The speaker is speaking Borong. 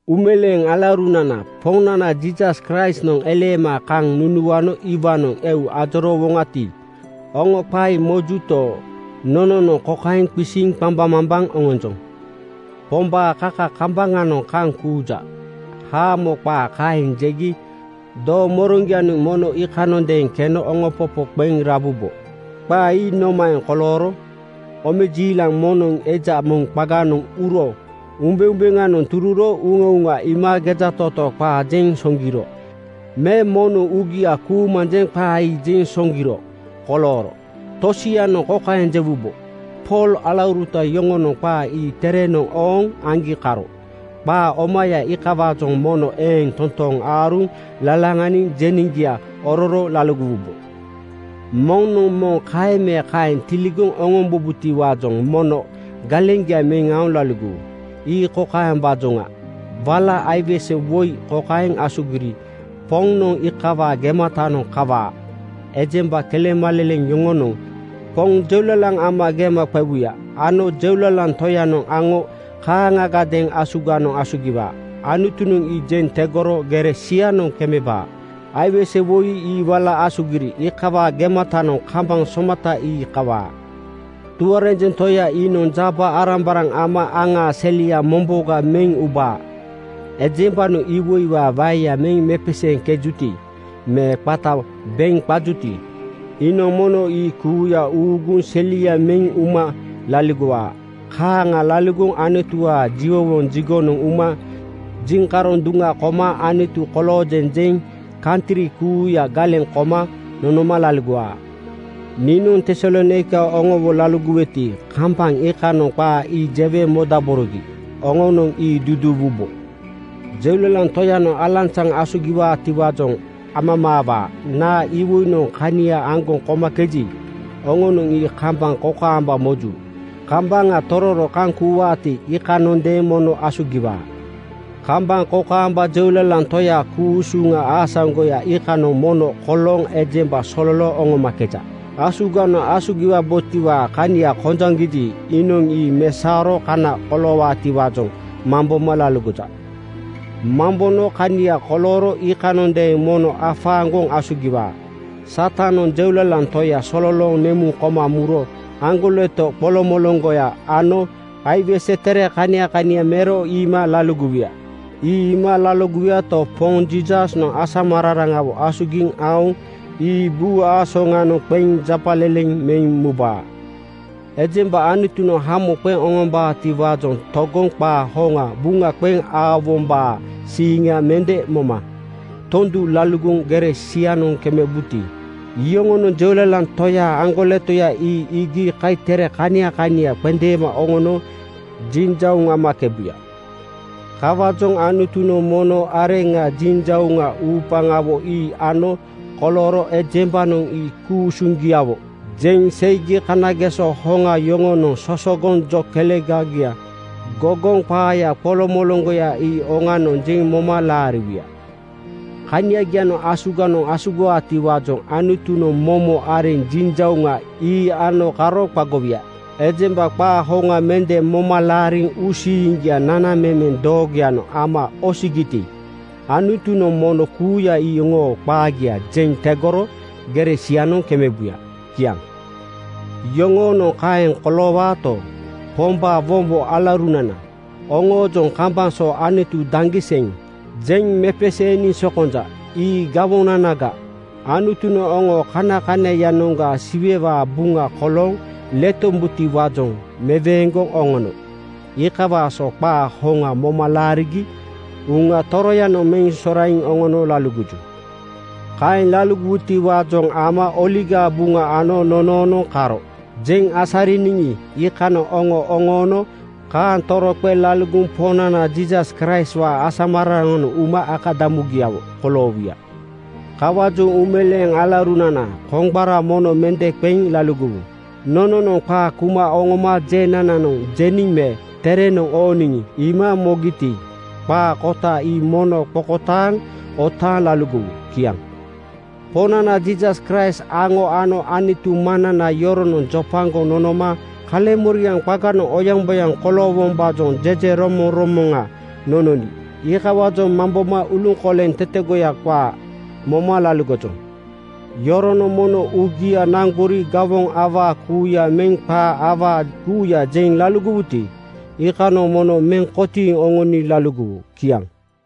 Uumeleeŋ alaurunana, Poŋnana Jiisas Kraistnoŋ eleema kaŋ nunuano iwaanoŋ eu ajoroowoŋati, oŋo qaa ii mojuto, nononoŋ kokaeŋ qisiŋ qambaŋmambaŋ oŋonjoŋ: “Pombaa kaka kambaŋanoŋ kaŋ kuuja,” haamo qaa kaeŋ jegi doomoroŋgianoŋ mono iikanondeeŋ keno oŋopopo qeŋ rabubo. Qaa ii nomaeŋ kolooro? Omejiilaaŋ moŋnoŋ eja moŋ qaganoŋ uro umbeumbeŋanoŋ tururo uŋauŋa iima gejatootoo qaa jeŋ soŋgiro me moŋnoŋ uugia kuumanjeŋ qaa ii jeŋ soŋgiro kolooro? Tosianoŋ kokaeŋ jewubo, “Pool alauruta yoŋonoŋ qaa ii terenoŋ ooŋ aŋgi karo.” Qaa omaya iikawaajoŋ mono eeŋ totooŋ aaruŋ lalaŋaniŋ jeneŋgia ororo laligowubo. Moŋnoŋ moŋ kaeŋ me kaeŋ tiligoŋ oŋombabotiwaajoŋ mono galeŋgia meŋ aoŋ laligowu. Ii kokaembaajoŋa: Wala aiwese woi kokaeŋ asugiri Poŋnoŋ iikawaa gematanoŋ kawaa: Ejemba kelemaleleŋ yoŋonoŋ Poŋ jeulalaŋ ama gema qewuya ano Jeulalaŋ Toyanoŋ aŋo kaaŋagadeeŋ asuganoŋ asugiwaa. Anutunoŋ ii jeŋ tegoro gere sianoŋ kemebaa. Aiwese woi ii wala asugiri iikawaa gematanoŋ kambaŋ somata ii kawaa. Tuarenjeŋ Toya iinoŋ jaba-arambaraŋ ama aŋaa selia momboga meŋ ubaa. Ejembanoŋ iwoiwaa waeya meŋ mepeseeŋkejuti me qata beŋ qajuti, iinoŋ mono ii kuuya uŋuuguŋ selia meŋ uma laligowaa. Kaaŋa laligoŋ Anutuwaa jiwowoŋ jigonoŋ uma jiŋkaroŋ duŋa koma “Anutu koloojeŋ,” jeŋ kantri kuuya galeŋ koma nonoma laligowaa. Niinoŋ Tesalonaika oŋowo laligoweti, kambaŋ iikanoŋ qaa ii jewe modaborogi. Oŋonoŋ ii duduuwubo. Jeulalaŋ Toyanoŋ alanzaŋ asugiwaatiwaajoŋ amamaawaa. Naa iwoinoŋ kania aŋgoŋ komakeji, oŋonoŋ ii kambaŋ kokaamba moju. Kambaŋa tororo kaŋ kuuwaati, iikanoŋadeeŋ mono asugiwaa. Kambaŋ kokaamba Jeulalaŋ Toyaa ku-usuŋa aasaŋgoya iikanoŋ mono kolooŋ ejemba sololooŋ oŋomakeja. Asuganoŋ asugiwabotiwaa kania kojaŋgiji, iinoŋ ii mesaoro kana koloowaatiwaajoŋ mamboma laligoja. Mambono kania kolooro iikanoŋadeeŋ mono afaaŋgoŋ asugiwaa. Satanoŋ Jeulalaŋ Toya sololooŋ nemuŋ koma muro aŋgoleto qoloŋmoloŋgoya ano aiwese tere kania kania mero iima laligowuya. Ii iima laligowuyato, Poŋ Jiisasnoŋ asamararaŋawo asugiŋ aoŋ ii buu aasoŋanoŋ qeŋ japaleleŋ meŋ mubaa. Ejemba Anutunoŋ hamo qeŋ oŋombaatiwaajoŋ togoŋ qaa hoŋa buŋa qeŋ aowombaa siiŋa mende moma tondu laligoŋ gere sianoŋ kemebuti, iyoŋonoŋ Jeulalaŋ Toyaa aŋgoletoya ii iigi kaitere kania kania qendeema oŋono jinjauŋ amakebuya. Kawaajoŋ Anutunoŋ momo areŋ jinjauŋa uupaŋawo ii ano kolooro ejembanoŋ ii ku-usuŋgiawo jeŋ seigi kanageso hoŋa yoŋonoŋ sosogoŋ jo kelega gogoŋ qaaya qoloŋmoloŋgoya ii oŋanoŋ jeŋ moma laariwuya. Kaniagianoŋ asuganoŋ asugiwaatiwaajoŋ Anutunoŋ momo areŋ jinjauŋa ii ano karo qagowuya. Ejemba qaa hoŋa mende moma laariŋ uusiiŋgia nanamemeŋ doogoyanoŋ ama osigiti, Anutunoŋ mono kuuya iyoŋoo qaagia jeŋ tegoro gere sianoŋ kemebuya. Kiaŋ. Yoŋoonoŋ kaeŋ koloowaato, Pombaa wombo alauruna, oŋoojoŋ kambaŋ so “Anutu daŋgiseŋ!” jeŋ mepeseeniŋ sokonja. Ii gawonanaga. Anutunoŋ oŋo kanakanaiyanoŋga Siwewaa buŋa kolooŋ letombutiwaajoŋ meweeŋgoŋ oŋono. Iikawaa so qaa hoŋa moma laarigi Uŋa Toroyanoŋ meŋ soraiŋ oŋono laligoju. Kaaŋ laligowutiwaajoŋ ama Oligaa Buŋa ano nonoonoŋ karo jeŋ asariniŋi, iikanoŋ oŋo oŋoono. Kaaŋ toroqeŋ laligoŋ Poŋnana Jiisas Kraistwaa asamararanoŋ uma akadamugiawo koloowuya. Kawaajoŋ uumeleeŋ alaurunana, koŋgbara mono mende qeŋ laligowu. Nononoŋ qaa kuma oŋoma jenananoŋ jeniŋ me terenoŋ ooniŋ iima mogiti, qaa kota ii mono qokotaaŋ otaaŋ laligowu. Kiaŋ. Poŋnana Jiisas Kraist aŋo ano Anutu Maŋnana yoronoŋ jopagoŋ nonoma kaleŋmoriaŋ qaganoŋ oyaŋboyaŋ koloowombaajoŋ jejeromoŋromoŋa nononi iikawaajoŋ mamboma uluŋkoleŋ tetegoya qaa moma laligojoŋ. Yoronoŋ mono uugia naŋgori gawoŋ awaa kuuya meŋ qaa awaa kuuya jeŋ laligowuti, iikanoŋ mono meŋ kotiiŋ oŋoni laligowu. Kiaŋ.